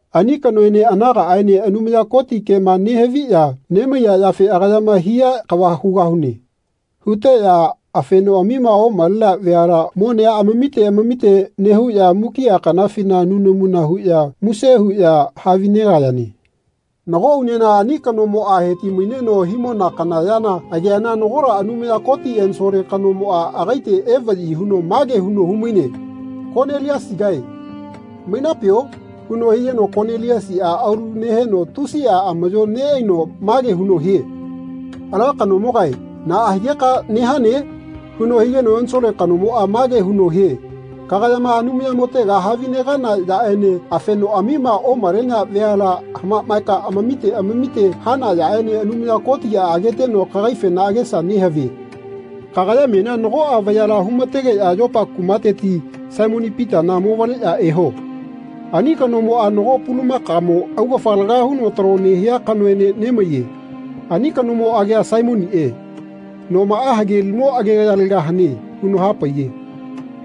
Ani kanoene anagaꞌaene Anumaya Koti kema nehaviꞌya nemaiya yafe “Agayama haiya kava hugahune.” huteꞌya afenoꞌamima omalenea veala monea amamite amamite nehuꞌya mukiꞌa kanafina nunamuna huꞌya muse huꞌya havinegayane. Nago unena ani kanomoꞌa heti-maineno himona kana yana ageana nagola Anumaya Koti ensole kanomoꞌa agaite evaꞌyi huno mage huno humaine “Koniliasigae mainapio?” huno higeno Koniliasiꞌa aulu neheno tusiꞌa amaꞌyo neꞌaino mage huno hie “Ala kanomogae naꞌa higeka nehane?” huno higeno ensole kanomoꞌa mage huno hie “Kagayama Anumayamotega havinegana yaꞌene afenoꞌamima omalenea veala hamaꞌmaeka amamite amamite hana yaꞌene Anumaya Kotiꞌa ageteno kagaifena agesa nehavie. Kagaya menia nagoꞌa vayala humategeꞌya Yopa kumateti Saimoni Pitana movaleꞌya eho. Ani kanomoꞌa nago pulamakamo augafa laga huno talo nehia kanoene nemaiye. Ani kanomo agia Saimoniꞌe. Nomaꞌa hagelimo agegayalega hane.” huno hapaiye.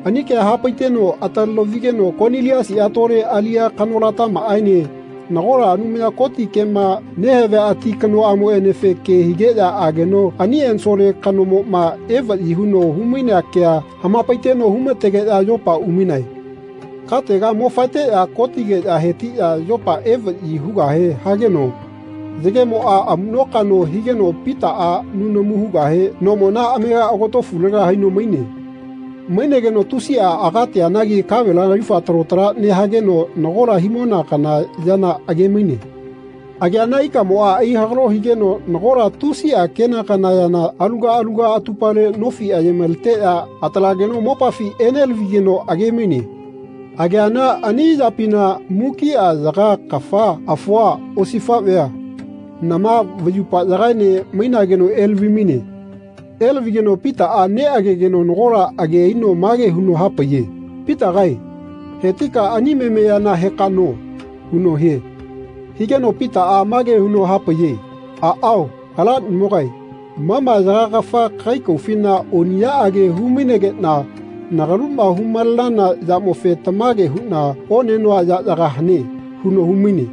Ani kea hapaiteno ataleno vigeno Koniliasiꞌa tole aliꞌya kanolatamaꞌaene nagola Anumaya Koti kema nehavia ati kanoꞌamoꞌenefe ke higeꞌya ageno ani ensole kanomoꞌma evaꞌyi huno humainea kea hamapaiteno humategeꞌya Yopa umainae. Katega mo-faeteꞌya kotigeꞌya hetiꞌya Yopa evaꞌyi hugahe hageno yagemoꞌa amuꞌno-kaꞌno higeno Pitaꞌa nunamu hugahe nomona amega agotofulega haino maine. Mainegeno tusiꞌa agateanagi kavela yaufa talo tala nehageno nagola himona kana yana age-maine. Ageana ikamoꞌa aihagalo higeno nagola tusiꞌa kena kana yana aluga aluga atupale nofi aye-maleteꞌya atalageno mopafi enelavigeno age-maine. Ageana ani yapina mukiꞌa yaka kafa afua osifaꞌvea nama vayupala yagaene mainageno elavi-maine. Elavigeno Pitaꞌa neꞌagegeno nagola age aino mage huno hapaiye “Pitagae hetika ani memeyana heka no.” huno hie. Higeno Pitaꞌa mage huno hapaiye “Aꞌao, Alanimogae ma ma yaga kafa kagai kaufina oniꞌyaꞌage humainegeꞌna nagaluma humalenana yamofe tamage huꞌna onenoa yaꞌyaga hane.” huno humaine.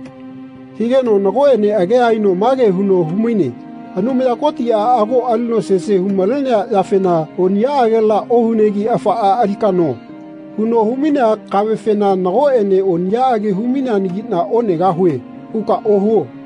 Higeno nagoꞌene agea aino mage huno humaine “Anumaya Kotiꞌa ago alino sese humalenea yafena ‘Oniꞌyaꞌagela ohunegi afaꞌa alika no.’ huno humainea kavefena nagoꞌene ‘Oniꞌyaꞌage humaineanagiꞌna onegahue.’ huka ohuo.”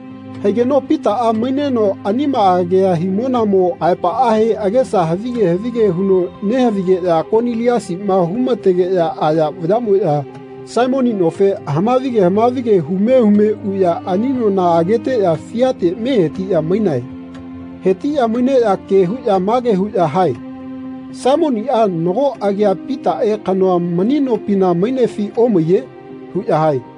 Haigeno Pitaꞌa maineno anima agea himonamo aepaꞌahe agesa havige havige huno nehavigeꞌya Koniliasiꞌma humategeꞌya aya vayaꞌmoꞌya Saimoni nofe hamavige hamavige hume hume uꞌya ani nona ageteꞌya fiate mehetiꞌya mainae. Hetiꞌya maineꞌya ke huꞌya mage huꞌya hae “Saimoniꞌa nago agia Pitaꞌe kanoa mani nopina mainefi omaiye?” huꞌya hae.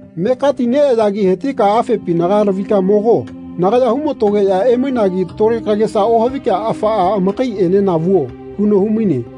Mekatineꞌayagi hetika afepinaga lavika mogo. Nagaya humatogeꞌya emainagi tole kagesa ohavika afaꞌa amakaiꞌenena vuo.” huno humaine.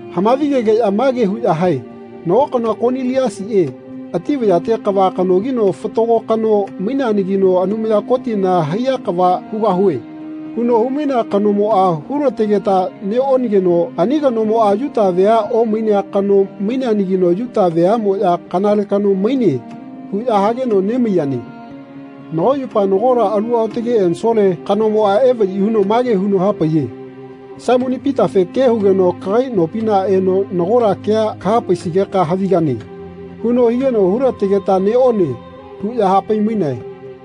Hamavigegeꞌya mage huꞌya hae “Nago kanoa Koniliasiꞌe ati vayate kava kanogino fatago kano maineanagino ‘Anumaya Kotina haiya kava hugahue.’ huno humainea kanomoꞌa hulategeta neꞌonageno ani kanomoꞌa Yuta vea omainea kano maineanagi Yuta veaꞌmoꞌya ‘Kanale kano maine.’ huꞌya hageno nemaiyane. Nago yupa nagola alu aotage ensole kanomoꞌa evaꞌyi huno mage huno hapaiye ‘Saimoni Pitafe ke hugeno kagai nopina eno nagola kea kahapaisigeka havigane.’ huno higeno hulategeta neꞌone” huꞌya hapai-mainae.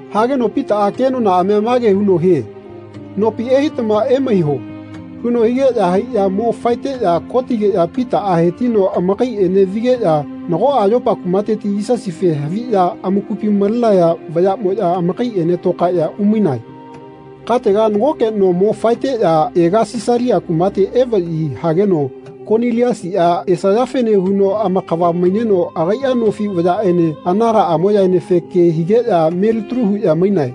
Hageno Pitaꞌa kenonaꞌamia mage huno hie “Nopi ehaitama emaiho.” huno higeꞌya haiꞌya mo faeteꞌya kotigeno Pitaꞌa hetino amakaiꞌene vigeꞌya nagoꞌa Yopa kumateti Yisasife haviꞌya amakupi malenaya vayaꞌmoꞌya amakaiꞌene tokaeꞌya umainae. Katega nagoke no mo faeteꞌya ega Sisalia kumate evaꞌyi hageno Koniliasiꞌa esayafene huno amakava maineno agaiꞌa nofi vayaꞌene anagaꞌamoꞌyaenefe ke higeꞌya melitalu huꞌya mainae.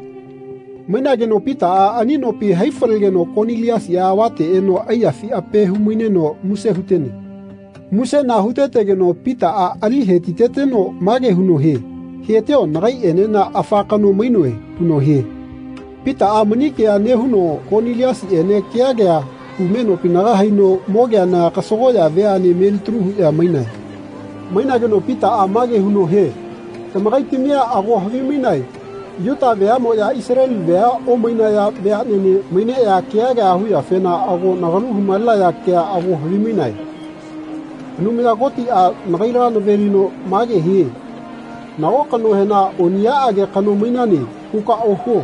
Mainageno Pitaꞌa ani nopi hai-falegeno Koniliasiꞌa avate eno aiyafi ape humaineno muse hutene. Musena hutetegeno Pitaꞌa ali hetiteteno mage huno hie “Hetio nagaiꞌenena afa kano mainoe.” huno hie. Pitaꞌa mani kea nehuno Koniliasiꞌene kea kea hume nopinaga haino mogeana kasagoꞌya veaꞌne melitalu huꞌya mainae. Mainageno Pitaꞌa mage huno hie tamakaitamia ago havimainae Yuta veaꞌmoꞌya Isaleli vea omainaya veaꞌnene maineꞌya kea kea huyafena ago nagalu humalenaya kea ago havimainae. Anumaya Kotiꞌa nagaila navelino mage hie “Nago kanohena ‘Oniꞌyaꞌage kano mainane.’ huka ohuo.”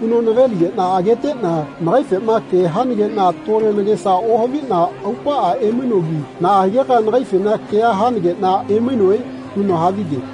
huno naveligeꞌna ageteꞌna nagaifema ke hanageꞌna tole nagesa ohaviꞌna aupaꞌa emainogi naꞌa higeka nagaifena kea hanageꞌna emainoe? huno havige.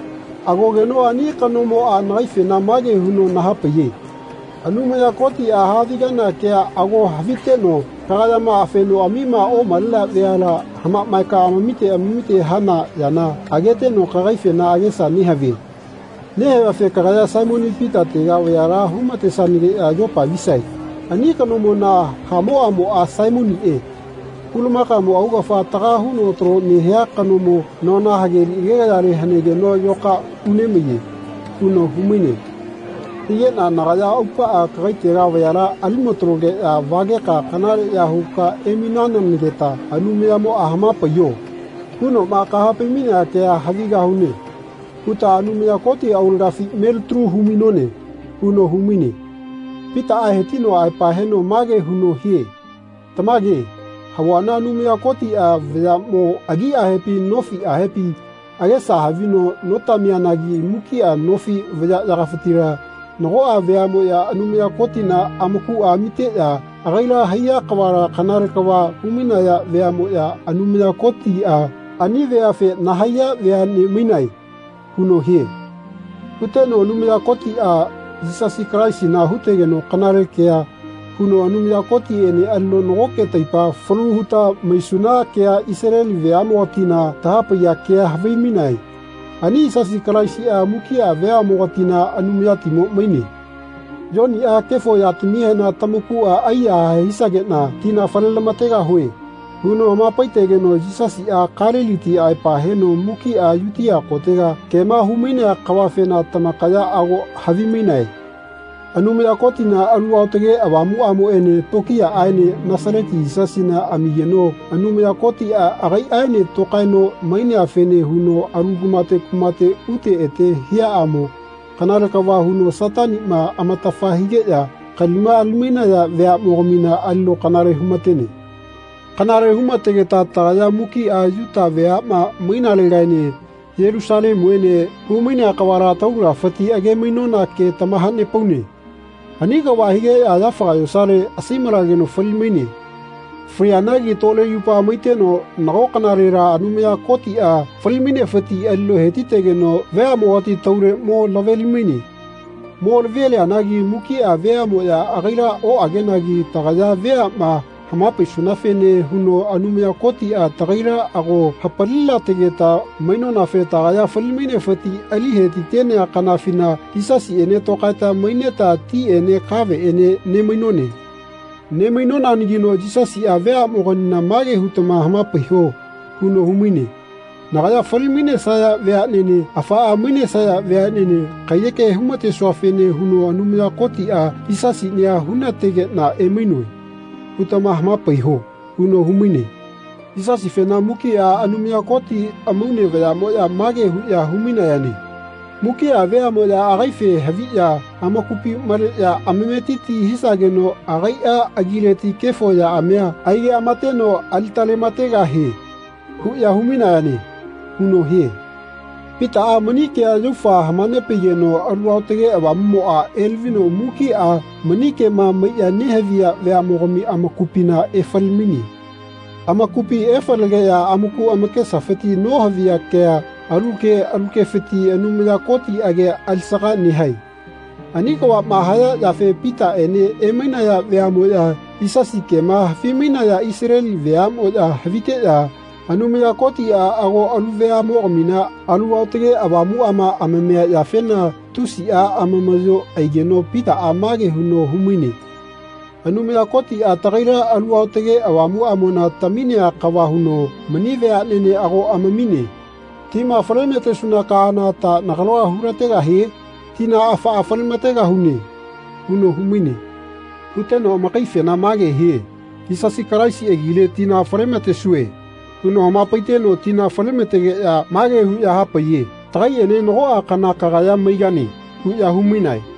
Agogeno ani kanomoꞌa nagaifena mage huno nahapaiye ‘Anumaya Kotiꞌa haavigana kea ago haviteno kagayama afenoꞌamima omalenea veala hamaꞌmaeka amamite amamite hana yana ageteno kagaifena agesa nehavie. Nehaviafe kagaya Saimoni Pitatega vayala humatesanageꞌya Yopa visae. Ani kanomona hamoꞌamoꞌa Saimoniꞌe pulamakamo augafa taga huno talo nehia kanomo nona hageli agegayale hanegeno yoka unemaiye.’ huno humaine. Higeꞌna nagaya aupaꞌa kagaitega vayala alimatalogeꞌya vageka kanaleꞌya huka emainanageta Anumayamoꞌa ‘Hamapaiyo.’ hunoꞌma kahapai-mainea kea havigahune huta Anumaya Koti aulagafi melitalu humainone.” huno humaine. Pitaꞌa hetino aepa heno mage huno hie “Tamage, havuana Anumaya Kotiꞌa vayaꞌmo agiꞌahepi nofiꞌahepi agesa havino notamianagi mukiꞌa nofi vayaꞌyagafitila nagoꞌa veaꞌmoꞌya Anumaya Kotina amakuꞌa amiteꞌya ‘Agaila haiya kavala kanale kava humainaya veaꞌmoꞌya Anumaya Kotiꞌa ani veafe nahaiya veaꞌne mainae.’ huno hie.” Huteno Anumaya Kotiꞌa Yisasi Kalaisina hutegeno kanale kea huno Anumaya Kotiꞌene alino nagoke taipa falu huta maisuna kea Isaleli veaꞌmogatina tahapaiya kea havimainae. Ani Yisasi Kalaisiꞌa mukiꞌa veaꞌmogatina Anumayatimo maine. Yoniꞌa “Kefo yatamihena tamakuꞌa aiyahae hisageꞌna tina falelamategahue.” huno hamapaitegeno Yisasiꞌa Kaliliti aepa heno mukiꞌa Yutia kotega kema humainea kavafena tamakaya ago havimainae. Anumaya Kotina Alu Aotage Avamuꞌamoꞌene tokiyaꞌaene Nasaleti Yisasina amigeno Anumaya Kotiꞌa agaiꞌaene tokaeno maineafene huno alu kumate kumate ute ete hiaꞌamo kanale kava huno Sataniꞌma amatafa higeꞌya kalima ali-mainaya veaꞌmogamina alino kanale humatene. Kanale humategeta tagaya mukiꞌa Yuta veaꞌma mainalegaene Yelusalemuene humainea kavala taulagafiti age-mainona ke tamahanepaune. Ani kava higeꞌya yafaga yosale asaimalageno fali-maine. Falianagi tole yupa maiteno nago kanalela Anumaya Kotiꞌa fali-mainefiti alino hetitegeno veaꞌmogati taule mo laveli-maine. Mo lavelianagi mukiꞌa veaꞌmoꞌya agaila oꞌagenagi tagaya veaꞌma hamapaisunafene huno Anumaya Kotiꞌa tagaila ago hapalilategeta mainonafe tagaya fali-mainefiti ali hetitenea kanafina Yisasiꞌene tokaeta maineta tiꞌene kaveꞌene nemainone. Nemainonanagino Yisasiꞌa veaꞌmogamina mage hutama hamapaiho huno humaine “Nagaya fali-mainesaya veaꞌnene afaꞌa mainesaya veaꞌnene kaiyeke humatesuafene huno Anumaya Kotiꞌa Yisasinia hunategeꞌna emainoe.” hutama hamapaiho. huno humaine. Yisasifena mukiꞌa Anumaya Koti amaune vayaꞌmoꞌya mage huꞌya humainayane “Mukiꞌa veaꞌmoꞌya agaife haviꞌya amakupi maleꞌya amametiti hisageno agaiꞌa agileti kefo yaꞌamia aigeꞌamateno alitalemategahie. huꞌya humainayane.” huno hie. Pitaꞌa mani kea yaufa hamanepaigeno Alu Aotage Avamuꞌmoꞌa elavino mukiꞌa mani kema maiꞌya nehaviya veaꞌmogami amakupina efalemaine. Amakupi efalegeꞌya amaku amakesafiti nohaviya kea alu ke alu kefiti Anumaya Koti agia alisaga nehae. Ani kavaꞌma haya yafe Pitaꞌene emainaya veaꞌmoꞌya Yisasi kema havimainaya Isaleli veaꞌmoꞌya haviteꞌya Anumaya Kotiꞌa ago alu veaꞌmogamina Alu Aotage Avamuꞌama amamia yafena tusiꞌa amamaꞌyo aigeno Pitaꞌa mage huno humaine. “Anumaya Kotiꞌa tagaila Alu Aotage Avamuꞌamona taminea kava huno mani veaꞌnene ago amamine. Tima falematesuna kaana ta nagalua hulategahie? Tina afaꞌa falemategahune.” huno humaine. Huteno amakaife mage hie “Yisasi Kalaisi agile tina falelamatesue.” huno hamapaiteno tina falematetegeꞌya mage huꞌya hapaiye “Tagaiꞌene nagoꞌa kana tagaya maigane.” huꞌya humainae.